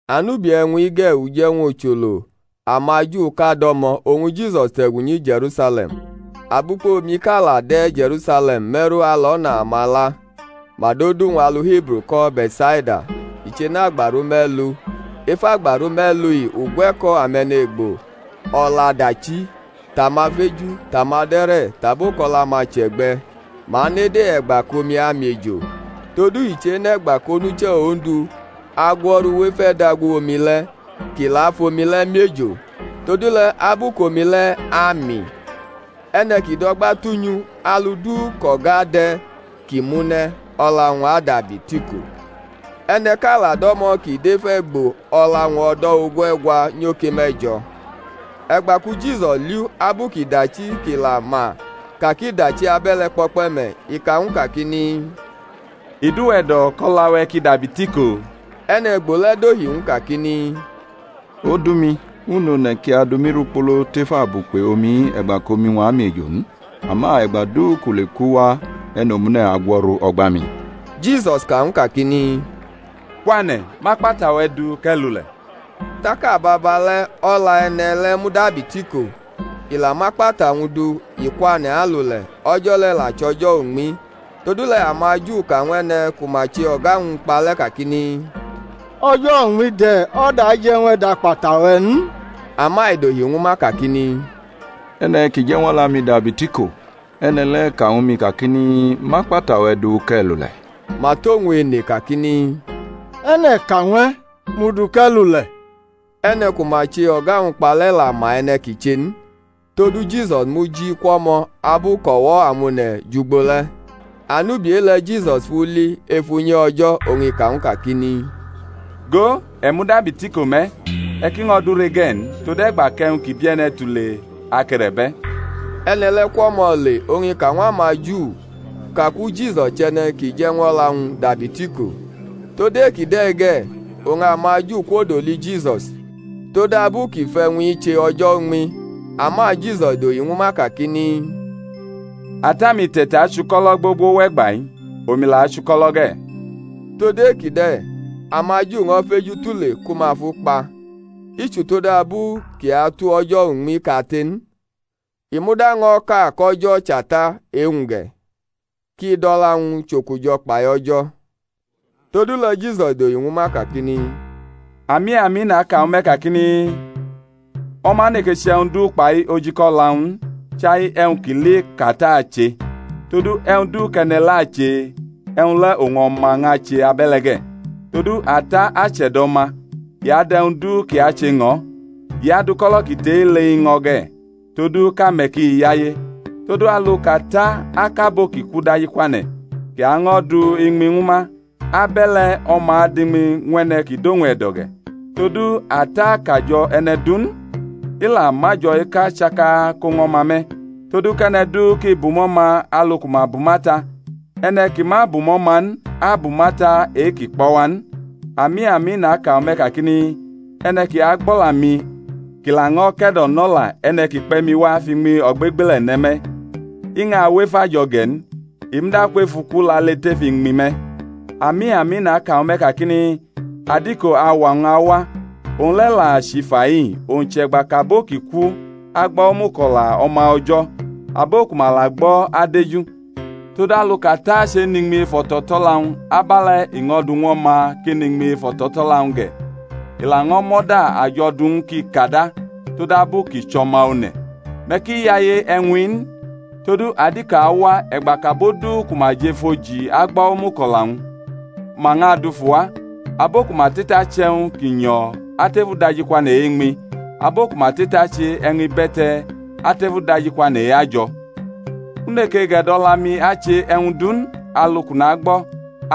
Anubi e̩wñ-i ge̩ uje̩wñ ucholo amaJuʼka do̩mo̩, oñ Jisus te̩gu nyi Je̩rusale̩m. Abukpe omiʼka la de̩ Je̩rusale̩m me̩ru alo̩na amala; ma dʼodu-wñ alu Hibru ko̩ Be̩tsaida; i che̩nʼagbaru me̩lu. Ef agbaru me̩lu-i ugwe̩ko̩ ame̩ne̩gbo o̩la dachi, tʼamafeju, tʼamade̩re̩, tʼabo kʼo̩la-ma che̩gbe̩. [Ma nede e̩gba kʼomi amiejo: todu i chenʼe̩gba kʼonuche̩ Ondu agwo̩ru wʼef e̩dagu-omi le̩ kʼi la fʼomi le̩ miejo; todule̩ abu kʼomi le̩ ami, e̩ne̩ ki dʼo̩gba tunyʼu, alu du kʼo̩ga de̩ ki mʼu ne̩, o̩la-wñ adabi tiko.] E̩ne̩ʼka la do̩mo̩ kʼi dʼef e̩gbo o̩la-wñ o̩do̩ ogue̩gwa nyoke me̩jo̩. E̩gba ku Jisus li-u abu kʼi dachi, kʼi la ma ka kʼi dachi abe̩le̩ kpo̩kpe̩ me̩, i ka ñw u kakini, I dʼuwe̩ e̩do̩ kʼo̩la-we̩ ki dabi tiko? E̩ne̩gbo le̩ dohi ñw u kakini, Odu-mi, u nʼone̩ ki adu mi rikpolo tef abukpe̩ omi-i e̩gba kʼomi-wñ amiejo n; ama e̩gba du kʼu le kʼu wa e̩nomune̩ agwo̩ru o̩gba mi. Jisus ka ñw u kakini, Kwane̩, mʼakpata-we̩ du kʼe̩ lule̩. Tak ababale̩ o̩la e̩ne̩ le̩ mudabi tiko, i la mʼakpata-wñ du i kwane̩ alule̩. O̩jo̩ le̩ la chʼo̩jo̩ uñmi. Todule̩ amaju ka ñw e̩ne̩ ku ma che o̩ga-wñ kpa le̩ kakini, O̩jo̩ uñmi de̩, o̩da je̩ ñw e̩ dʼakpata-we̩ n. Ama i dohi ñwu ma kakini, E̩ne̩ ki je̩ ñw o̩la-mi dabi tiko, e̩ne̩ le̩ ka ñwu mi kakini, Mʼakpata-we̩ du kʼe̩ lule̩. Ma tʼowñ ene kakini, E̩ne̩ ka ñw e̩, Mʼu du, kʼe̩ lule̩? E̩ne̩ ku ma che o̩ga-wñ kpa le̩ la ma e̩ne̩ ki che n; todu Jisus muji kwʼo̩mo̩ abu kʼo̩wo̩-amone̩ jʼugbo le̩. Anubi e-le̩ Jisus fʼu li ef unyi O̩jo̩, oñ i ka ñw u kakini, Go, e̩ mudabi tiko me̩; e̩ ki ño̩ dure ge̩ n, tode̩gba kʼe̩wñ ki bie̩ne̩ tule ake̩re̩bʼe̩. E̩ne̩ le̩ kwʼo̩mo̩ le; oñ i ka ñw amaJu kaku Jisus chʼe̩ne̩ kʼi je̩ ñw o̩la-wñ dabi tiko. Tod ekide̩ ge̩ oñ amaJu kwodoli Jisus, todabu kʼi fʼe̩wñ-i che o̩jo̩ uñmi. Ama Jisus dohi ñwu ma kakini, Ata-mi te̩tachuko̩lo̩ gbogbo wʼe̩gba-i, omi la achuko̩lo̩ ge̩. Todu ekide̩ amaJu ño̩ feju tule ku ma fʼu kpa, i chutodabu kʼi atu o̩jo̩ uñmi kate n, i muda ño̩ ka kʼO̩jo̩ chʼAta e-wñ ge̩; kʼi dʼo̩la-wñ chʼokujo̩ kpai O̩jo̩. Todule̩ Jisus dohi ñwu ma kakini, Ami, ami naka ñwu me̩ kakini, O̩ma neke chʼe̩wñ du kpai ojika o̩la-wñ n, chai e̩wñ kʼi li kʼAta ache; todu e̩wñ du kʼe̩ne̩ le̩ ache, e̩wñ le̩ oñ O̩ma ñʼache abe̩le̩ ge̩. Todu Ata ache̩do̩ O̩ma; i adʼe̩wñ du kʼi ache ñʼo̩; i adʼuko̩lo̩ ki tʼe-i le i ñʼo̩ ge̩, todu kʼame̩ ki yaye. Todu alu kʼAta akʼabo ki ku dajikwane̩, kʼi año̩ du iñmi ñwu ma, abe̩le̩ O̩ma adʼiñmi ñw e̩ne̩ ki dʼowñ e̩do̩ ge̩. Todu Ata akajo̩ e̩ne̩ du n, i la mʼajo̩ eka chaka ko ñw O̩ma me̩; todu kʼe̩ne̩ du ki bumʼO̩ma alu ku ma bumʼAta. E̩ne̩ ki ma bumʼO̩ma n abumʼAta e-ki kpʼo̩ wa n. Ami, ami, naka ñwu me̩ kakini, E̩ne̩ ki agbʼo̩la-mi kʼi laño̩ ke̩do̩nola e̩ne̩ ki kpe̩ mi wa fʼiñmi ogbegbele̩ ne̩ me̩, i ñʼawʼef ajo̩ ge̩ n, i muda kwʼef uku lale tef iñmi me̩. Ami, ami, naka ñwu me̩ kakini, Adiko auwa-wñ awa, owñ le̩ la chʼifa-i, owñ chʼe̩gba kʼabo ki ku agbo̩ omuko̩la O̩ma O̩jo̩; abo ku ma la gbo̩ adeju. Todu alu kʼAta chenʼiñmi ef o̩to̩to̩la-wñ, abe̩le̩ i ño̩ du ñw O̩ma kʼi nʼiñmi ef o̩to̩to̩la-wñ ge̩; i laño̩ mʼo̩da ajo̩ du ñw u kʼi kada, todabu kʼi chʼO̩ma One̩. Me̩ ki yaye e̩wñ-i n; todu adiko awa e̩gba kʼabo du ku ma jʼef oji agbo̩ omuko̩la-wñ, ma ñʼadufu wa; abo ku ma te̩tachʼe̩wñ ki nyo̩ atef udajikwane̩ e-iñmi, abo ku ma te̩tache e̩wñ ibe̩te̩ atef udajikwane̩ e-ajo̩. U neke gʼe̩do̩la-mi ache e̩wñ du n; alu kʼu nagbo̩,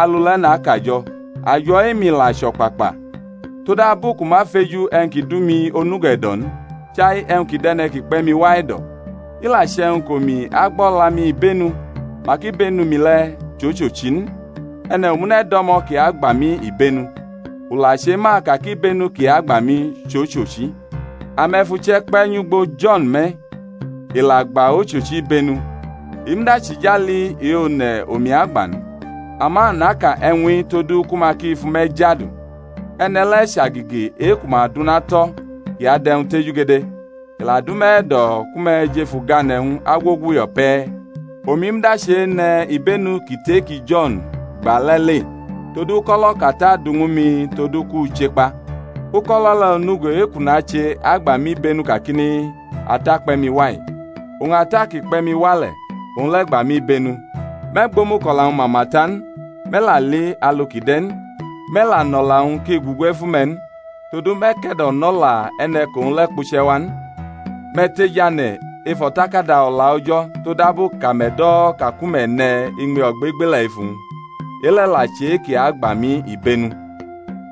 alu le̩ nakajo̩, ajo̩ e-mi la chʼo̩kpakpa, todabu kʼu ma feju e̩wñ ki du mi onugo e̩do̩ n, chai e̩wñ ki dʼe̩ne̩ ki kpe̩ mi wa e̩do̩. I la che̩wñ kʼomi agbʼo̩la-mi ibenu, mak ibenu-mi le̩ chʼochochi n. E̩ne̩ omune̩ do̩mo̩ kʼi agba mi ibenu, u la chema ka kʼibenu kʼi agba mi chʼochochi. Ame̩ fʼuche̩ kpe̩ nyugbo Jo̩n me̩, i la gba ochochi ibenu, i muda chʼijali e-one̩ omi agba n; ama naka e̩wñ-i todu ku ma ki fʼume̩ jadu. E̩ne̩ le̩ chʼagege e-ku ma dʼuna tʼo̩ kʼi adʼe̩wñ tejugede; i la dʼume̩ e̩do̩ ku me̩ jʼef ugane̩-wñ agwoguyo̩ pe̩. Omi muda chene̩ ibenu ki tʼe-ki Jo̩n gba le̩ le; todu uko̩lo̩ kʼAta du ñwu mi todu kʼu chekpa, uko̩lo̩ le̩ onugo e-kʼu nache agba mi ibenu kakini, Ata kpe̩ mi wa-i. Oñ Ata ki kpe̩ mi wa le̩, owñ le̩ gba mi ibenu. Me̩ gbʼomuko̩la-wñ mama ta n, me̩ la li alu kʼi de̩ n. Me̩ la nʼo̩la-wñ ki gugu ef ume̩ n; todu me̩ ke̩do̩nola e̩ne̩ kʼowñ le̩ kpuche̩ wa n. Me̩ tejane̩ ef O̩takada O̩la O̩jo̩ todabu kʼame̩ do̩ ka ku me̩ ne̩ iñmi ogbegbele̩ ef uwñ; e-le̩ la chʼe-kʼi agba mi ibenu,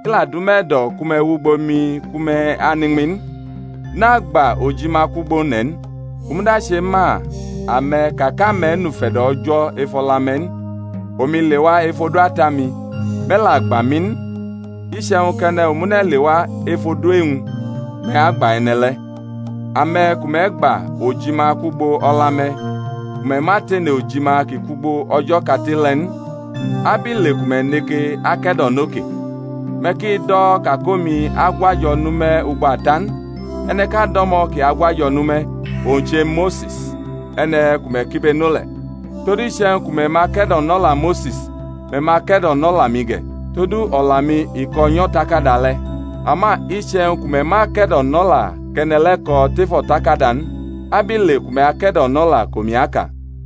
i la dʼume̩ e̩do̩ ku me̩ wʼugbo mi ku me̩ anʼiñmi n. Nagba ojima kwʼugbo one̩ n. U muda chema ame̩ ka kʼame̩ nʼufe̩do̩ O̩jo̩ ef o̩la-me̩ n. Omi lewa ef odu Ata-mi, me̩ la gba mi n; iche̩wñ kʼe̩ne̩ omune̩ lewa ef odu e-wñ, me̩ agba e̩ne̩ le̩. Ame̩ ku me̩ gba ojima kwʼugbo o̩la-me̩, ku me̩ ma tene ojima ki kwugbo O̩jo̩ kate le̩ n, abile ku me̩ neke ake̩do̩no ke? Me̩ ki do̩ ka kʼomi agwʼajo̩ nʼume̩ ugbo Ata n; e̩ne̩ʼka do̩mo̩ ki agwajo̩ nʼume̩, owñ che Mose̩s, e̩ne̩ ku me̩ kibeno le̩. Todu iche̩wñ ku me̩ ma ke̩do̩nola Mose̩s, me̩ ma ke̩do̩nola mi ge̩; todu o̩la-mi i ko̩ nyʼo̩takada le̩. Ama iche̩wñ ku me̩ ma ke̩do̩nola kʼe̩ne̩ le̩ ko̩ tef o̩takada n, abile ku me̩ ake̩do̩nola kʼomi aka?